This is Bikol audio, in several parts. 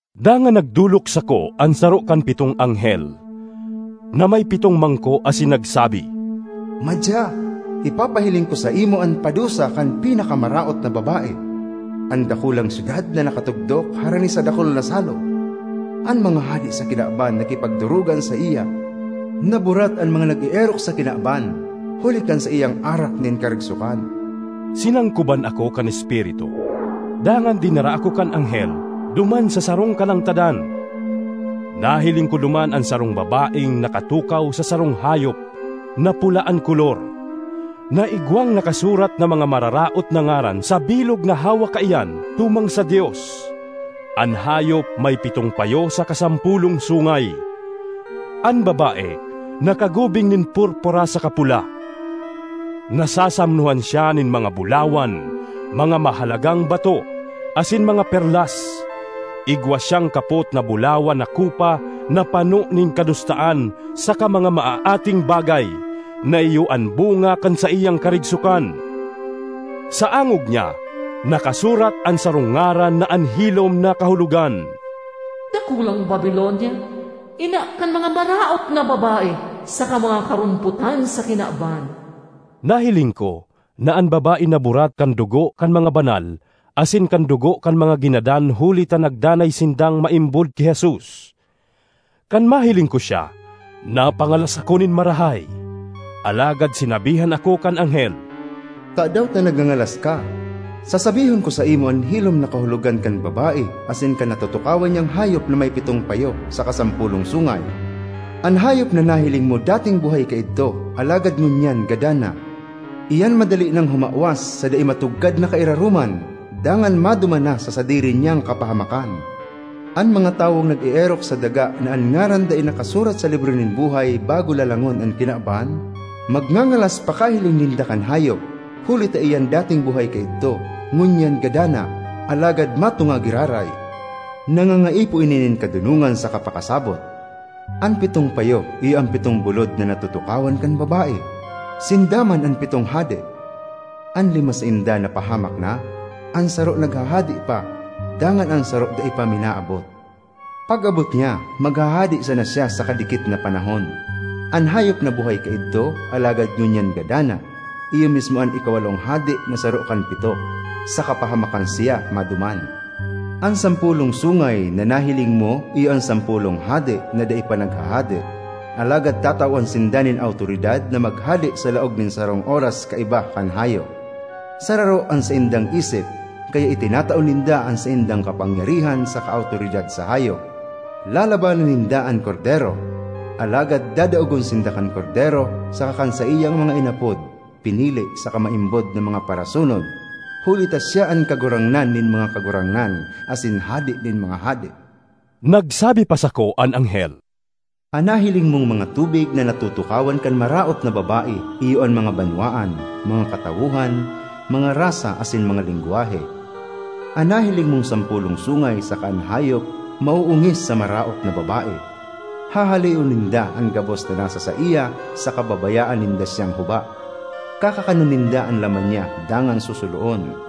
Dangan nagdolok sako an saro kan pitong anghel na may pitong mangko asin nagsabi, “Madya, ipapahiling ko saimo an padusa kan pinakamaraot na babae—an dakulang syudad na nakatugdok harani sa dakul na salog. An mga hade sa kinaban nakipagdorogan saiya. Naburat an mga nag-eerok sa kinaban huli kan saiyang arak nin karigsokan.” Sinangkoban ako kan Espiritu, dangan dinara ako kan anghel duman sa sarong kalangtadan. Nahiling ko duman an sarong babaeng nakatukaw sa sarong hayop na pula an kolor, na igwang nakasurat na mga mararaot na ngaran sa bilog na hawak kaiyan tumang sa Dios. An hayop may pitong payo saka sampolong sungay. An babae nakagubing nin purpura saka pula; nasasamnohan siya nin mga bulawan, mga mahalagang bato, asin mga perlas. Igwa siyang kapot na bulawan na kopa na pano nin kadustaan saka mga maaating bagay, na iyo an bunga kan saiyang karigsokan. Sa angog niya nakasurat an sarong ngaran na an hilom na kahulogan: “Dakulang Babilonia, ina kan mga maraot na babae saka mga karompotan sa kinaban.” Nahiling ko na an babae naburat kan dugo kan mga banal asin kan dugo kan mga ginadan huli ta nagdanay sindang maimbod ki Jesus. Kan mahiling ko siya, napangalas ako nin marahay. Alagad sinabihan ako kan anghel, “Tadaw ta nagngangalas ka? Sasabihon ko saimo an hilom na kahulogan kan babae asin kan natutukawan niyang hayop na may pitong payo saka sampolong sungay. An hayop na nahiling mo dating buhay kaidto, alagad ngunyan gadan na; iyan madali nang humawas sa dai matugkad na kairaroman, dangan maduman na sa sadiri niyang kapahamakan. An mga tawong nag-eerok sa daga na an ngaran dai nakasurat sa libro nin buhay bago lalangon an kinaban, magngangalas pakahiling ninda kan hayop, huli ta iyan dating buhay kaidto, ngunyan gadan na, alagad matunga giraray. ”Nangangaipo ini nin kadonongan saka pakasabot. An pitong payo iyo an pitong bulod na natutukawan kan babae. Sinda man an pitong hade: an lima sainda napahamak na, an saro naghahade pa dangan an saro dai pa minaabot. Pag-abot niya, maghahade sana siya sa kadikit na panahon. An hayop na buhay kaidto alagad ngunyan gadan na, iyo mismo an ikawalong hade na saro kan pito. Sa kapahamakan siya maduman. ”An sampolong sungay na nahiling mo iyo an sampolong hade na dai pa naghahade, alagad tatawan sinda nin awtoridad na maghade sa laog nin sarong oras kaiba kan hayop. Sararo an saindang isip, kaya itinatao ninda an saindang kapangyarihan saka awtoridad sa hayop. Lalabanan ninda an Kordero, alagad dadaogon sinda kan Kordero saka kan saiyang mga inapod, pinili, saka maimbod na mga parasunod, huli ta siya an Kagurangnan nin mga kagurangnan asin Hade nin mga hade.” Nagsabi pa sako an anghel, “An nahiling mong mga tubig na natutukawan kan maraot na babae iyo an mga banwaan, mga katawohan, mga rasa asin mga lengwahe. An nahiling mong sampolong sungay saka an hayop maoongis sa maraot na babae. Hahaleon ninda an gabos na nasa saiya saka babayaan ninda siyang huba; kakakanon ninda an laman niya dangan susuloon.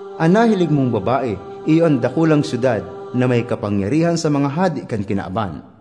”An nahiling mong babae iyo an dakulang syudad na may kapangyarihan sa mga hade kan kinaban.”